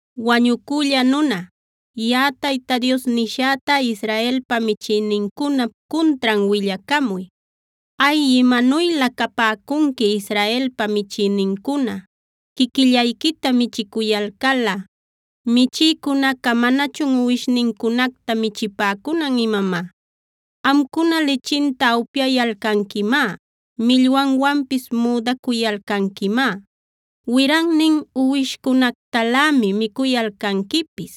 “Wañucülla nuna, yaꞌa Tayta Dios nishäta, Israelpa michïnincunap cuntran willacamuy: ‘¡Ay, imanuylä capäcunqui Israelpa michïnincuna, quiquillayquita michicuyalcalꞌa! ¿¡Michïcunaca manachun uwishnincunacta michipäcunan imamá!? Amcuna lichinta upyayalcanquimá; millwanwanpis müdacuyalcanquimá; wirannin uwishcunactalämi micuyalcanquipis.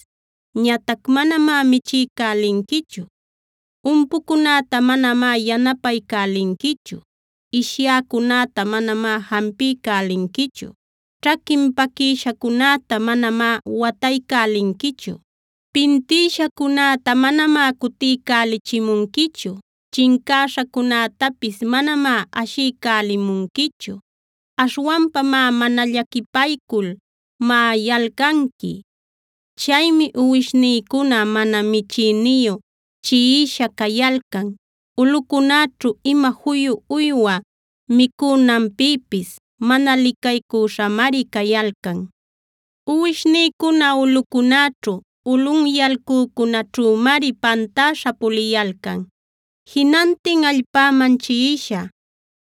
Ñatac manamá michiycälinquichu. Umpucunäta manamá yanapaycälinquichu; ishyäcunäta manamá jampiycälinquichu; ćhaquin paquïshacunäta manamá wataycälinquichu; pintïshacunäta manamá cutiycälichimunquichu; chincäśhacunätapis manamá ashiycälimunquichu. Aśhwanpamá mana llaquipaycul maꞌayalcanqui. Chaymi uwishnïcuna mana michïniyu chiꞌisha cayalcan. Ulꞌucunäćhu ima juyu uywa micünanpïpis mana licaycuśhamari cayalcan. Uwishnïcuna ulꞌucunäćhu, ulꞌunyalcücunäćhümari pantäśha puliyalcan, jinantin allpäman chiꞌisha.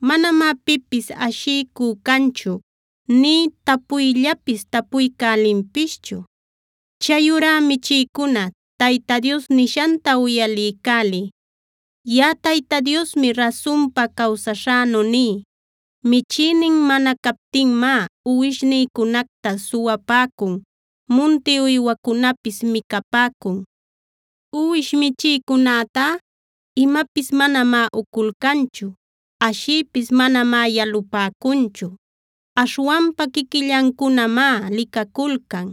Manamá pipis ashiycü canchu nï tapuyllapis tapuycälinpischu. “ ‘Chayurá michïcuna Tayta Dios nishanta uyaliycäliy. Yaꞌa Tayta Diosmi rasunpa cawsaśhänu ní: Michïnin mana captinmá uwishnïcunacta suwapäcun, munti uywacunapis micapäcun. Uwish michïcunätá imapis manamá uculcanchu, ashïpis manamá yalupäcunchu. Aśhwanpa quiquillancunamá licaculcan.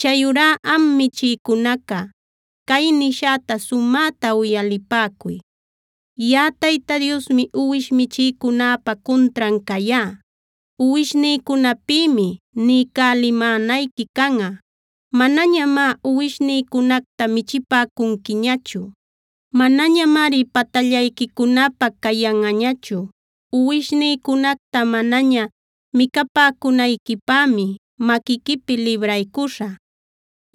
Chayurá am michïcunaca, cay nishäta sumäta uyalipäcuy: Yaꞌa Tayta Diosmi uwish michïcunäpa cuntran cayá. Uwishnïcunapïmi niycälimänayqui canꞌa. Manañamá uwishnïcunacta michipäcunquiñachu; manañamari patallayquicunapä cayanꞌañachu. Uwishnïcunacta manaña micapäcunayquipämi maquiquipi libraycuśhä.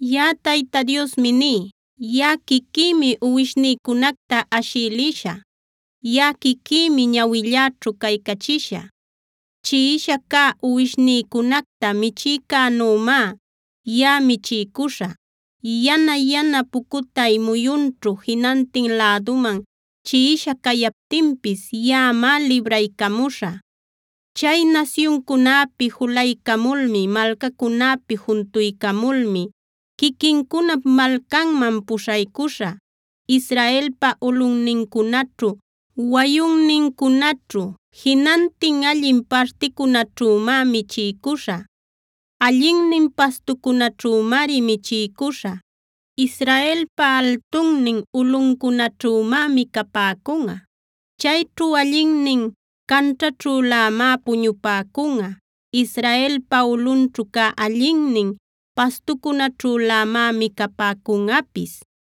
“ ‘Yaꞌa Tayta Diosmi ní: Yaꞌa quiquïmi uwishnïcunacta ashï lishä. Yaꞌa quiquïmi ñawilläćhu caycachishä. Chiꞌisha cä uwishnincunacta michïcänümá yaꞌa michiycuśhä. Yana-yana pucutay muyunćhu jinantin läduman chiꞌisha cayaptinpis yaꞌamá libraycamuśhä. Chay nasyuncunäpi julaycamulmi, malcacunäpi juntuycamulmi quiquincunap malcanman puśhaycuśhä. Israelpa ulꞌunnincunaćhu, wayunnincunaćhu, jinantin allin particunaćhümá michiycuśhä. Allinnin pastucunäćhümari michiycuśhä; Israelpa altunnin ulꞌuncunaćhümá micapäcunꞌa. Chayćhu allinnin canćhaćhülämá puñupäcunꞌa; Israelpa ulꞌunćhu cä allinnin pastucunaćhülämá micapäcunꞌapis.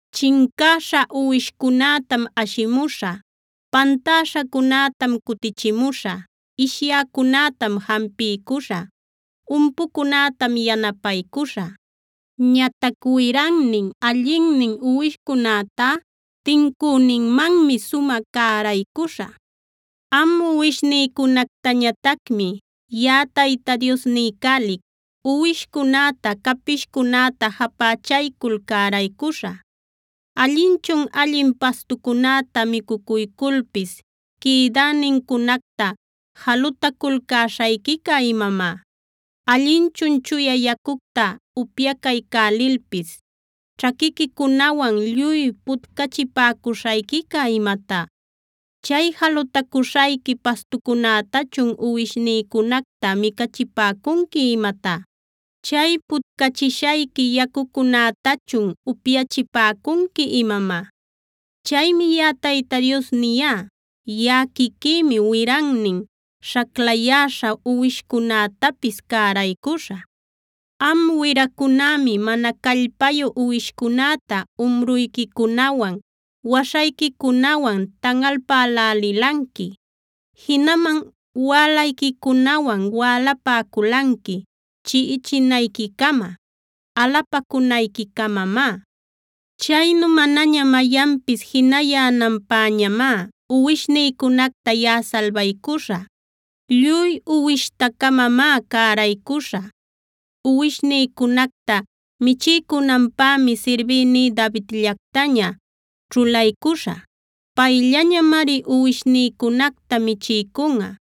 Chincäśha uwishcunätam ashimuśhä; pantäśhacunätam cutichimuśhä; ishyäcunätam jampiycuśhä; umpucunätam yanapaycuśhä. Ñatac wirannin, allinnin uwishcunätá tincüninmanmi sumä cäraycuśhä. “ ‘Am uwishnïcunactañatacmi yaꞌa Tayta Dios niycälic: Uwishcunäta, capishcunätam japächaycul cäraycuśhä. ¿Allinchun allin pastucunäta micucuyculpis quïdänincunacta jalutaculcäśhayquica imamá? ¿Allinchun chuya yacucta upyacaycälilpis ćhaquiquicunawan lluy putcachipäcuśhayquica imatá? ¿Chay jalutacuśhayqui pastucunätachun uwishnïcunacta micachipäcunqui imatá? ¿Chay putcachishayqui yacucunätachun upyachipäcunqui imamá? “ ‘Chaymi yaꞌa Tayta Dios niyá: Yaꞌa quiquïmi wirannin, saclayäśha uwishcunätapis cäraycuśhä. Am wiracunämi mana callpayu uwishcunäta umruyquicunawan, waśhayquicunawan tanꞌalpälälilanqui.a Jinaman wälayquicunawan wälapäculanqui chiꞌichinayquicama, alapacunayquicamamá. Chaynu manaña mayanpis jinayänanpäñamá uwishnïcunacta yaꞌa salbaycuśhä. Lluy uwishta-camamá cäraycuśhä. Uwishnïcunacta michiycunanpämi sirbïní Davidllacta ćhulaycuśhä. Payllañamari uwishnïcunacta michiycunꞌa.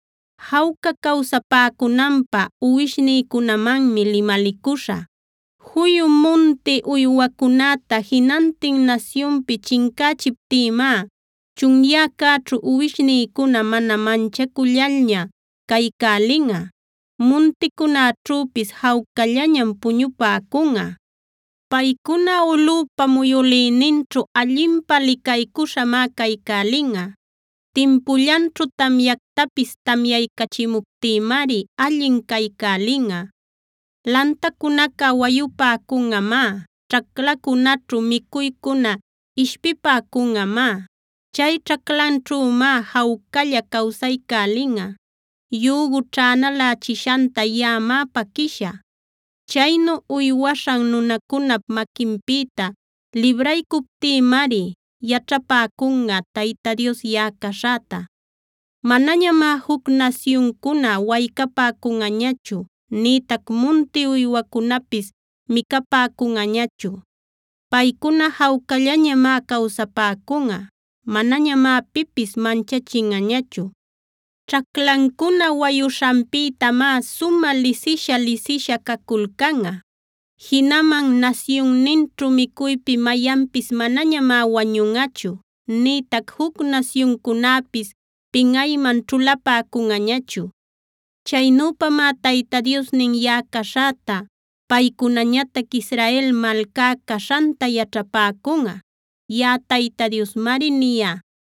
“ ‘Jawca cawsapäcunanpä uwishnïcunamanmi limalicuśhä. Juyu munti uywacunäta jinantin nasyunpi chincächiptïmá chunyäcäćhu uwishnïcuna mana manchacullalña caycälinꞌa; munticunäćhüpis jawcallañam puñupäcunꞌa. Paycuna ulꞌüpa muyülïninćhu allinpä licaycuśhamá caycälinꞌa. Timpullanćhu tamyactapis tamyaycachimuptïmari allin caycälinꞌa. Lantacunaca wayupäcunꞌamá; ćhaclacunäćhu micuycuna ishpipäcunꞌamá. Chay ćhaclanćhümá jawcalla cawsaycälinꞌa. Yügu ćhänalächishanta yaꞌamá paquïshä. Chaynu uywaśhan nunacunap maquinpïta libraycuptïmari yaćhapäcunꞌa Tayta Dios yaꞌa caśhäta. Manañamá juc nasyuncuna waycapäcunꞌañachu, nïtac munti uywacunapis micapäcunꞌañachu. Paycuna jawcallañamá cawsapäcunꞌa; manañamá pipis manchachinꞌañachu. Ćhaclancuna wayuśhanpïtamá sumä lisisha-lisisha caculcanꞌa. Jinaman nasyunninćhu micuypi mayanpis manañamá wañunꞌachu, nïtac juc nasyuncunäpis pinꞌayman ćhulapäcunꞌañachu. Chaynüpamá Tayta Diosnin yaꞌa caśhäta, paycunañatac Israel malcá caśhanta yaćhapäcunꞌa. Yaꞌa Tayta Diosmari niyá.